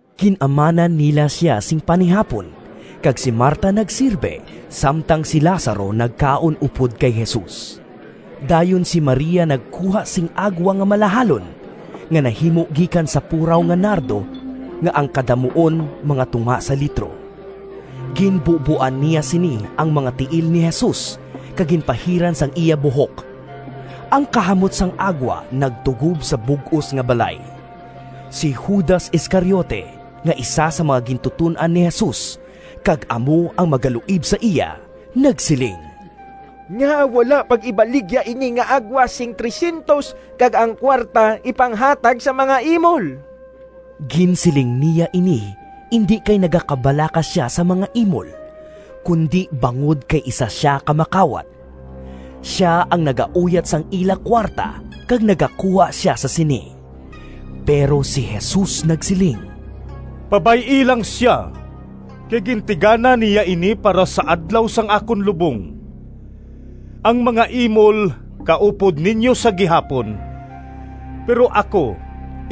Gin-amanan nila sia sing panihapon kag si Marta nagsirbe, samtang si Lazaro nagkaon upod kay Jesus. Dayon si Maria nagkuha sing agwa nga malahalon, nga nahimo gikan sa puraw nga nardo nga ang kadamuon mga tunga sa litro. Ginbuboan niya sini ang mga tiil ni Jesus kag ginpahiran sang iya buhok. Ang kahamot sang agwa nagtugob sa bug-os nga balay. Si Judas Iscariote nga isa sang mga gintuton-an ni Jesus, kag amo ang magaluib sa iya, nagsiling, “Ngaa wala pag-ibaligya ini nga agwa sing P300 kag ang kuwarta ipanghatag sa mga imol?” Ginsiling niya ini indi kay nagakabalaka sia sa mga imol, kundi bangod kay isa sia ka makawat. Sia ang nagauyat sang ila kuwarta kag nagakuha sia sa sini. Pero si Jesus nagsiling, “Pabay-i lang sia! Kay gintigana niya ini para sa adlaw sang akon lubong. Ang mga imol kaupod ninyo sa gihapon, pero ako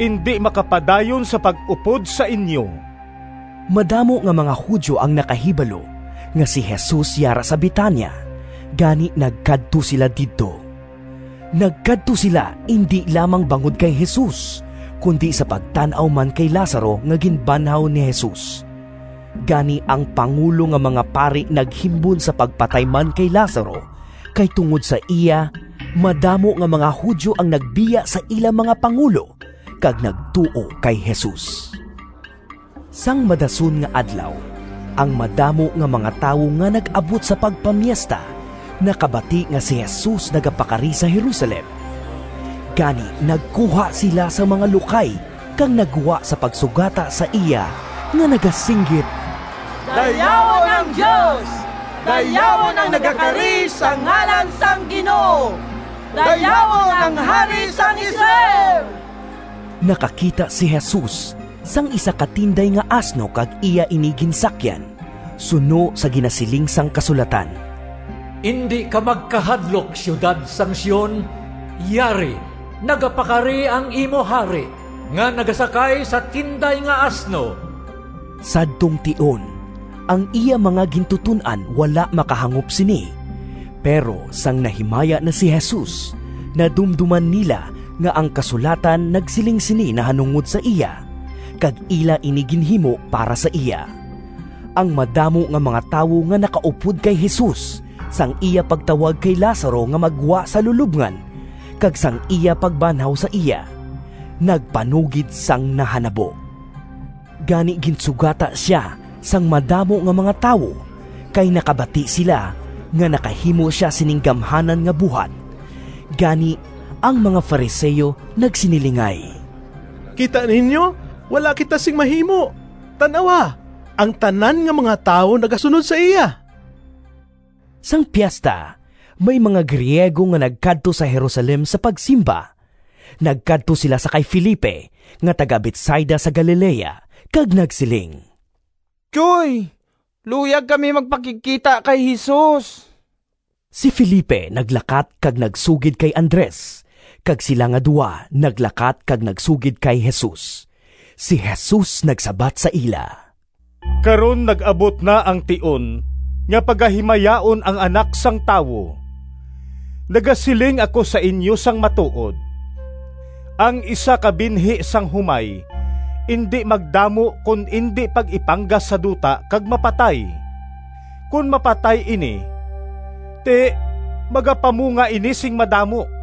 indi makapadayon sa pag-upod sa inyo.” Madamo nga mga Judio ang nakahibalo nga si Jesus yara sa Betania, gani nagkadto sila didto. Nagkadto sila indi lamang bangod kay Jesus, kundi sa pagtan-aw man kay Lazaro nga ginbanhaw ni Jesus. Gani ang pangulo nga mga pari naghimbon sa pagpatay man kay Lazaro, kay tungod sa iya madamo nga mga Judio ang nagbiya sa ila mga pangulo kag nagtuo kay Jesus. Sang madason nga adlaw, ang madamo nga mga tawo nga nag-abot sa pagpamiesta nakabati nga si Jesus nagapakari sa Jerusalem. Gani nagkuha sila sang mga lukay kag naggwa sa pagsugata sa iya nga nagasinggit, “Dayawon ang Dios! Dayawon ang nagakari sa ngalan sang Ginoo! Dayawon ang Hari sang Israel!” Nakakita si Jesus sang isa ka tinday nga asno kag iya ini ginsakyan, suno sa ginasiling sang kasulatan: “Indi ka magkahadlok, Siyudad sang Sion! Yari, nagapakari ang imo hari, Nga nagasakay sa tinday nga asno.” Sadtong tion, ang iya mga gintuton-an wala makahangop sini, pero sang nahimaya na si Jesus, nadumdoman nila nga ang kasulatan nagsiling sini nahanungod sa iya, kag ila ini ginhimo para sa iya. Ang madamo nga mga tawo nga nakaupod kay Jesus sang iya pagtawag kay Lazaro nga maggwa sa lulobngan kag sang iya pagbanhaw sa iya, nagpanugid sang nahanabo. Gani ginsugata sia sang madamo nga mga tawo, kay nakabati sila nga nakahimo sia sining gamhanan nga buhat. Gani, ang mga Fariseo nagsinilingay, “Kita ninyo, wala kita sing mahimo! Tan-awa, ang tanan nga mga tawo nagasunod sa iya!” Sang piesta, may mga Griego nga nagkadto sa Jerusalem sa pagsimba. Nagkadto sila sa kay Felipe nga taga-Betsaida, sa Galilea, kag nagsiling, “Tyoy, luyag kami magpakigkita kay Jesus.” Si Felipe naglakat kag nagsugid kay Andres, kag sila nga duha naglakat kag nagsugid kay Jesus. Si Jesus nagsabat sa ila, “Karon nag-abot na ang tion nga pagahimayaon ang Anak sang Tawo. Nagasiling ako sa inyo sang matuod: ang isa ka binhi sang humay indi magdamo kon indi pag-ipanggas sa duta kag mapatay. Kon mapatay ini, ti, magapamunga ini sing madamo.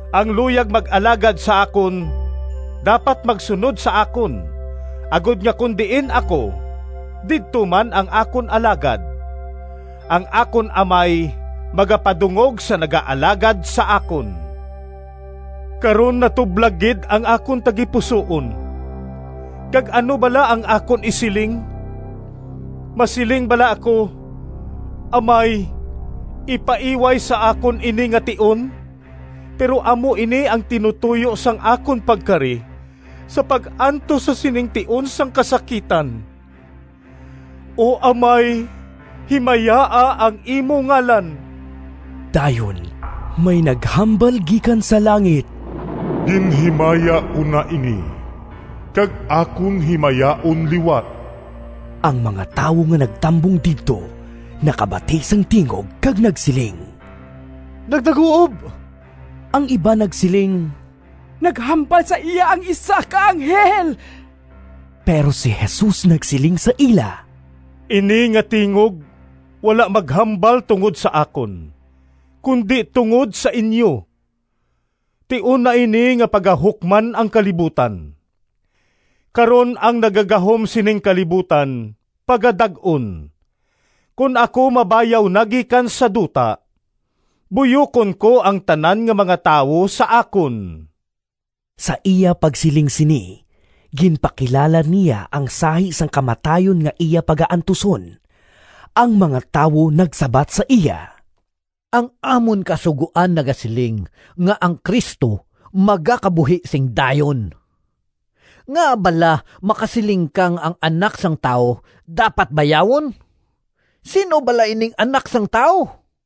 Ang luyag mag-alagad sa akon dapat magsunod sa akon, agod nga kon diin ako didto man ang akon alagad. Ang akon Amay magapadungog sa nagaalagad sa akon.” “Karon natublag gid ang akon tagipusoon; kag ano bala ang akon isiling? Masiling bala ako, ‘Amay, ipaiway sa akon ini nga tion’? Pero amo ini ang tinutoyo sang akon pagkari, sa pag-antos sa sining tion sang kasakitan. O Amay, himayaa ang imo ngalan!” Dayon may naghambal gikan sa langit, “Ginhimaya ko na ini, kag akon himayaon liwat.” Ang mga tawo nga nagatambong didto nakabati sang tingog kag nagsiling, “Nagdaguob!” Ang iban nagsiling, “Naghambal sa iya ang isa ka anghel!” Pero si Jesus nagsiling sa ila, “Ini nga tingog wala maghambal tungod sa akon, kundi tungod sa inyo. Tion na ini nga pagahukman ang kalibutan. Karon ang nagagahom sining kalibutan pagadag-on. Kon ako mabayaw na gikan sa duta, buyokon ko ang tanan nga mga tawo sa akon.” (Sa iya pagsiling sini, ginpakilala niya ang sahi sang kamatayon nga iya pagaantuson.) Ang mga tawo nagsabat sa iya, “Ang amon Kasugoan nagasiling nga ang Cristo magakabuhi sing dayon. Ngaa bala makasiling ka nga ang Anak sang Tawo dapat bayawon? Sin-o bala ining Anak sang Tawo?”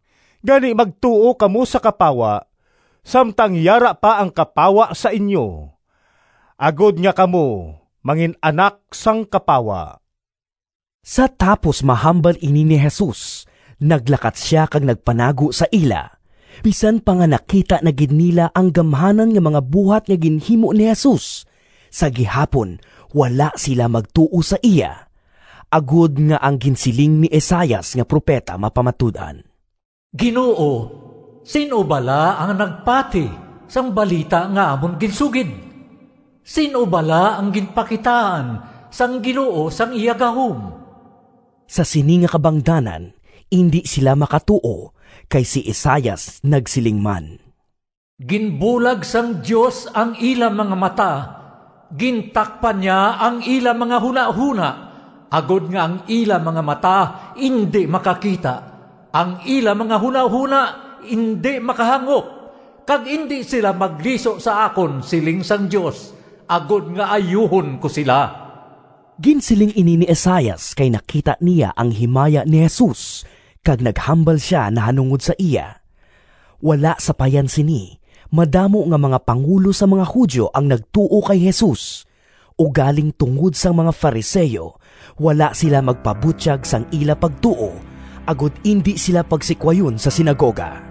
Gani magtuo kamo sa kapawa samtang yara pa ang kapawa sa inyo, agod nga kamo mangin-anak sang kapawa.” Sa tapos mahambal ini ni Jesus naglakat sia kag nagpanago sa ila. Bisan pa nga nakita na gid nila ang gamhanan nga mga buhat nga ginhimo ni Jesus, sa gihapon wala sila magtuo sa iya, agod nga ang ginsiling ni Isaias nga propeta mapamatud-an: “Ginoo, sin-o bala ang nagpati Sang balita nga amon ginsugid? Sin-o bala ang ginpakitaan Sang Ginoo sang iya gahom?” Sa sini nga kabangdanan indi sila makatuo, kay si Isaias nagsiling man: “Ginbulag sang Dios ang ila mga mata, Gintakpan niya ang ila mga hunahona, Agod nga ang ila mga mata Indi makakita, Ang ila mga hunahona indi makahangop, Kag indi sila magliso sa akon, Siling sang Dios, Agod nga ayuhon ko sila.” Ginsiling ini ni Isaias kay nakita niya ang himaya ni Jesus, kag naghambal sia nahanungod sa iya. Wala sapayan sini madamo nga mga pangulo sang mga Judio ang nagtuo kay Jesus, ugaling tungod sang mga Fariseo wala sila magpabutyag sang ila pagtuo, agod indi sila pagsikwayon sa sinagoga.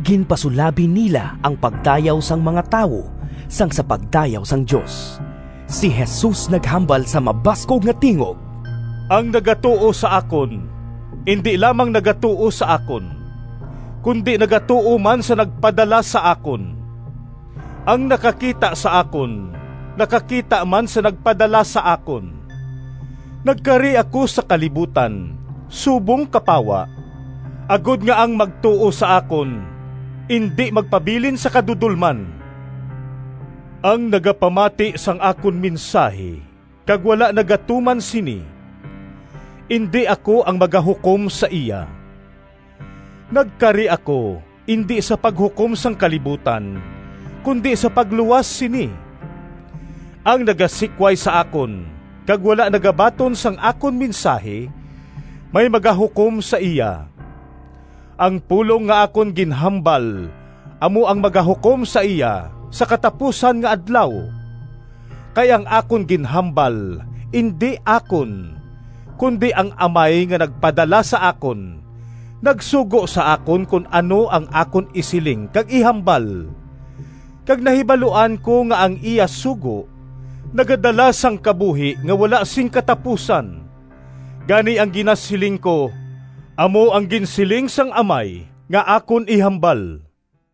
Ginpasulabi nila ang pagdayaw sang mga tawo sang sa pagdayaw sang Dios. Si Jesus naghambal sa mabaskog nga tingog, “Ang nagatuo sa akon, indi lamang nagatuo sa akon, kundi nagatuo man sa nagpadala sa akon. Ang nakakita sa akon nakakita man sa nagpadala sa akon. Nagkari ako sa kalibutan subong kapawa, agod nga ang magtuo sa akon indi magpabilin sa kadudolman. Ang nagapamati sang akon mensahi kag wala nagatuman sini, indi ako ang magahukom sa iya. Nagkari ako indi sa paghukom sang kalibutan, kundi sa pagluwas sini. Ang nagasikway sa akon kag wala nagabaton sang akon mensahi, may magahukom sa iya. Ang pulong nga akon ginhambal amo ang magahukom sa iya sa katapusan nga adlaw! Kay ang akon ginhambal indi akon, kundi ang Amay nga nagpadala sa akon nagsugo sa akon kon ano ang akon isiling kag ihambal. Kag nahibaluan ko nga ang iya sugo nagadala sang kabuhi nga wala sing katapusan. Gani ang ginasiling ko, amo ang ginsiling sang Amay nga akon ihambal.”